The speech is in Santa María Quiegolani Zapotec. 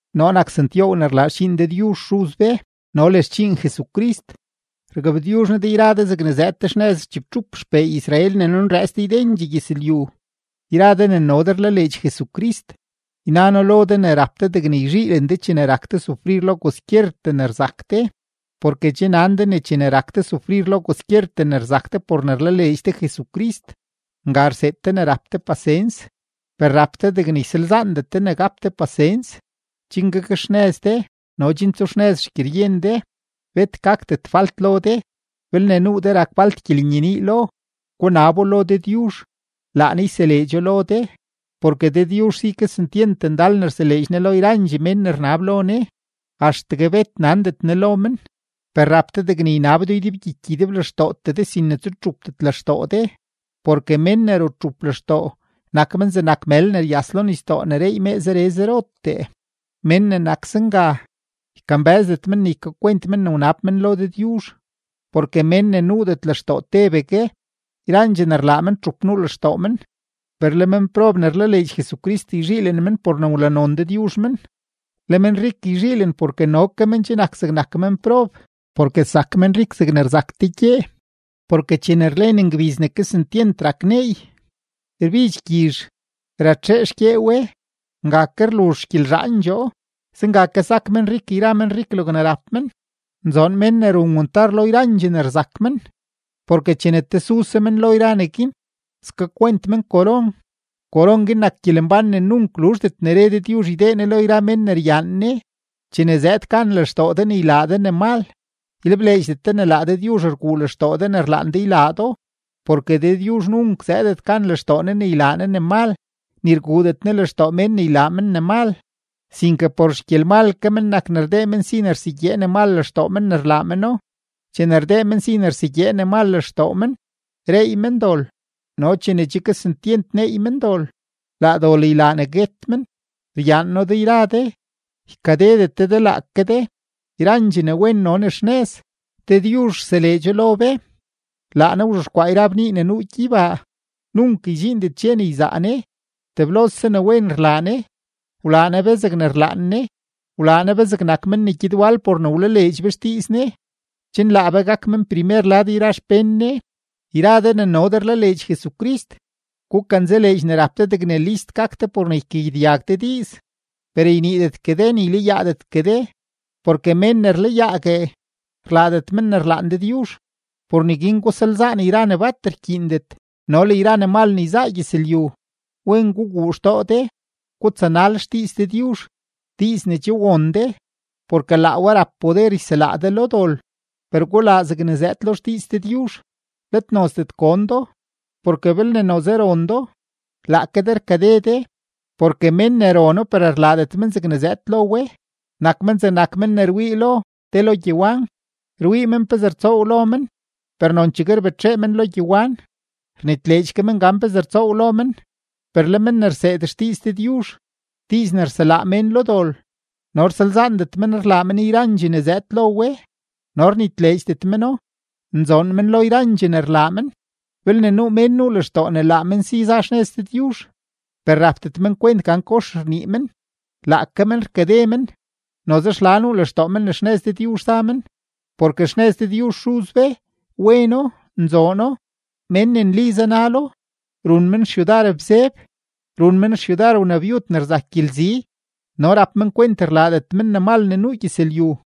Noo nak Santyoow ne rlaa xdxiin Dëdyuzh Xuz be no le xdxiin Jesucrist. Rgabtyuzh noo de yra de zegne zëëd de xnëz chibtxup xpee Israel ne nunrëëts de ydendxee gyëzlyu. Yra de ne no de rlaleedx Jesucrist, yna noo lo de ne rap de degne yzhiilen de chene rak de sufrir lo kwaskyertee ne rzak de, porke che nan de ne chene rak de sufrir lo kwaskyertee ne rzak de por ne rlaleedx de Jesucrist, nga rseed de rap de pasens. Per rap de degne ysalzaandet de ne gap de pasens, chen gakxnëz de no chen tsuxnëz xgyeryen de, bet gakdet falt lo de. Belne nuu de rak falt gyelenyenii lo, gunabo lo Dëdyuzh, laa Ne yseleedxo lo de; porke Dëdyuzh si kesentyent ndal ne rseleedx Ne lo yrandxee mén ne rnab lo Ne, axtegue bet nandet Ne lo men. Per rap de degne ynab do ydebgyiky ydeblextootee de, sin ne tsutxupdet lextoo de, porke mén ne rutxup lextoo, nak men zegnak mël ne ryas lo nisdoo ne reey mee zere zerotee; mén ne nak zenga, ykambë́zdet men ne ykakwent men ne wnab men lo Dëdyuzh. Porke mén ne nuudet lextoo tebegue, yrandxee ne rlaa men txup nuu lextoo men. Per le menprob ne rlaleedx Jesucrist yzhiilen men por ne wlanon Dëdyuzh men. Le menrik yzhiilen porke no ke men che nak zegnak menprob, porke sak menrik zegne rzak te gyee. Porke chene rlen ngbiz ne kesentyent rak neey, rbidx gyizh, ratxee xgyee we; nga ke rluzh xgyelzhaandxoo. Zenga ke sak menrik yra menrik logne rap men. Nzoon mén ne run wantar lo yrandxee ne rzak men, porke chene tesuse men lo yra neguin, skakwent men koron; koron guin nak gyelembán ne nunk luzhdet ne re Dëdyuzh ydee Ne lo yra mén ne ryaan Ne. Chene zëëd gan lextoo de ne ylaa de ne mal, ylebleedxdet de ne laa Dëdyuzh rguu lextoo de ne rlaan de ylaa do, porke Dëdyuzh nunk zëëdet gan lextoo Ne ylaa Ne ne mal, ni rguudet Ne lextoo mén ne ylaa men ne mal. Sinke por xgyelmal ke men nak ne rdee men si ne rsegyee ne mal lextoo men ne rlaa meno. Chene rdee men si ne rsegyee ne mal lextoo men, reey men dol, no chene che kesentyent neey men dol, laa dol ylaa ne guet men. Ryaan noo de yra de. Ykadedet de de laake de. Yrandxee ne wen no ne xnëz, Dëdyuzh rseleedxo lo be. Laa Ne wzhexkwaa yra bnii ne nuu gyeybaa; nunk ydxiindet dxe ne yzaa Ne, teblose ne wen rlaa Ne. Wlaa Ne be zegne rlaan Ne; wlaa Ne be zegnak men ne gyed wal por ne wlaleedx be xdiiz Ne, chen laa be gak men primer lad yra xpén Ne. Yra de ne no de rlaleedx Jesucrist, gukanzaleedx ne rap de degne list gak de por ne ykagyedyag de diiz, per yniidetgue de, ni ylayaadetgue de. Porke mén ne rlayaague, rlaadet men ne rlaan Dëdyuzh. Por neguin gusalzaan yra ne bat rkyiindet no le yra ne mal ne yzaa gyëzlyu. Wen guguu lextoo de, gutsanal xdiiz Dëdyuzh, diiz ne che won de, porke laa we rap poder yselaa de lo dol. Per gulaa zegne zëëd lo xdiiz Dëdyuzh, let nozdet gon do. Porke belne noze ron do, laake de rkade de. Porke mén ne rono per rlaadet men zegne zëëd lo we, nak men zegnak mén ne rwii lo te lo gyewan. Rwii men pezee rtsoow lo men, per nonchegue rbetxee men lo gyewan, rnitleedx ke men gan pezee rtsoow lo men. Per le men ne rseed xdiiz Dëdyuzh, diiz ne rselaa mén lo dol, no rsalzaandet men rlaa men yrandxee ne zëëd lo we no rnitleedxdet meno, nzoon men lo yrandxee ne rlaa men. Belne nuu mén nuu lextoo ne laa men si za xnëz Dëdyuzh, per rapdet men kwent gan kox rnii men, laake men rkade men, noze xla nuu lextoo men ne xnëz Dëdyuzh za men. Porke xnëz Dëdyuzh Xuz be, weno, nzoono; mén ne nli zanalo, run men xyudar bzeb, run men xyudar wnabyud ne rzak gyelzi no rap men kwent rlaadet men ne mal ne nuu gyëzlyu.